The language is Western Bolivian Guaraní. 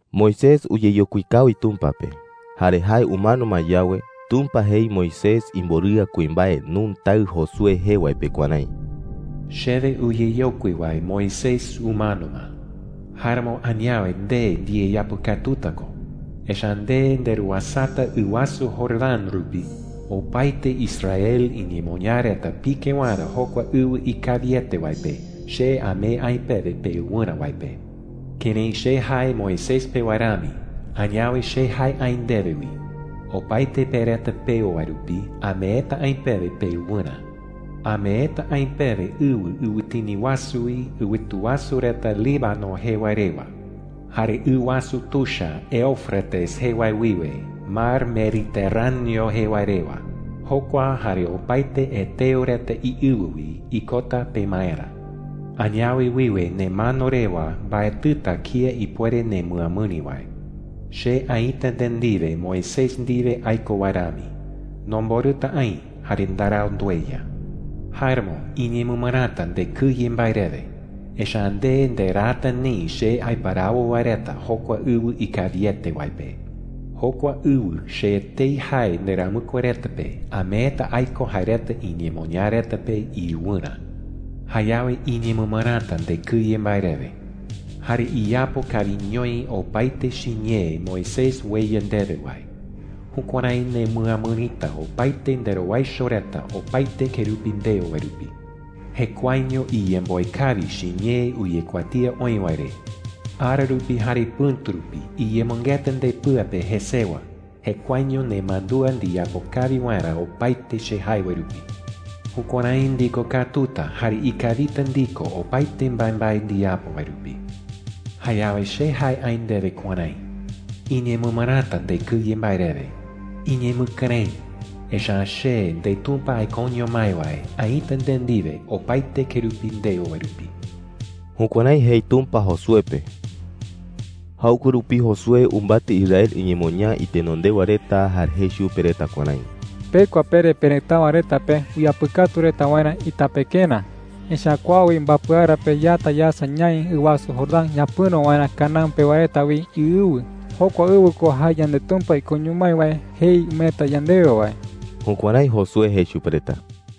Moisés uyeyokui kawi Tumpa pe. Jare jae umano ma yawe, Tumpa jei Moisés imborɨa kuimbae Nun taɨ Josué jee wae pe kuärái: “Chewe uyeyokui wae Moisés umano ma,” jei. “Jáeramo añawe nde ndiyeyapɨkatuta ko. Echa’ä nde nderuasata ɨ wasu Jordán rupi opaete Israel iñemoñaa reta pike waerä jokua ɨwɨ ikawiete wae pe, che amee aï pewe peɨwɨrä wae pe,” jei. “Kërái che jae Moisés pe wae rami, añawe che jae aï ndewe wi. Opaete pe reta peo wae rupi ameeta aï pewe peɨwɨrä,” jei. “Ameeta aï pewe ɨwɨ ɨwɨtini wasu wi ɨwɨtu wasu reta Líbano jee wae rewa, jare ɨ wasu tuicha Éufrates jee wae wiwe Mar Mediterráneo jee wae rewa. Jokua jare opaete heteo reta iɨwɨ wi ikota pemaerä,” jei chupe. “Añawe wiwe nemano rewa, mbaetɨta kía ipuere nemɨamɨri wae,” jei. “Che aïta nde ndiwe Moisés ndiwe aiko wae rami. Nomborɨta aï jare ndarau ndueya,” jei chupe. “Jáeramo iñemɨmɨräta ndekɨye mbae rewe, echa’ä nde nderaata neï che aiparawo wae reta jokua ɨwɨ ikawiete wae pe,” jei. “Jokua ɨwɨ che etei jae nderamɨkue reta pe ameeta aiko jae reta iñemoñaa reta pe iɨwɨrä,” jei chupe. “Jayawe iñemɨmɨräta ndekɨye mbae rewe,” jei. “Jare iyapo kawiñoi opaete chiñee Moisés ueya ndewe wae. Jukuärái nemɨamɨrita opaete nderowaicho reta opaete kerupi ndeo wae rupi,” jei. “Jekuaeño iyemboe kawi chiñee uyekuatía oï wae re. Ara rupi jare pɨ̈tu rupi iyemɨngeta ndepɨa pe jesewa jekuaeño nemandúa ndiyapo kawi waerä opaete che jae wae rupi,” jei. “Jukuärái ndikokatuta jare ikawita ndiko opaete mbaembae ndiyapo wae rupi,” jei. “Jayawe che jae aï ndewe kuärái: ¡Iñemɨmɨräta ndekɨye mbae rewe! Iñemɨkɨrëɨ, echa’ä che, ndeTumpa aikoño mái wae, aïta nde ndiwe opaete kerupi ndeo wae rupi.” Jukuärái jei Tumpa Josué pe. Jaɨkue rupi Josué umbatɨ Israel iñemoñaa itenondewa reta jare jei chupe reta kuärái: “Pekua pere perëtáɨwa reta pe uyapɨkatu reta waerä itapekerä,” jei. “Echa’ä kua wi mbapɨ ara pe, yata yasa ñaï ɨ wasu Jordán ñapɨ̈ro waerä Canaán pewa reta wi iɨwɨ. Jokua ɨwɨ ko jae yandeTumpa ikoño mái wae jei umeeta yandewe wae.” Jukuärái Josué jei chupe reta.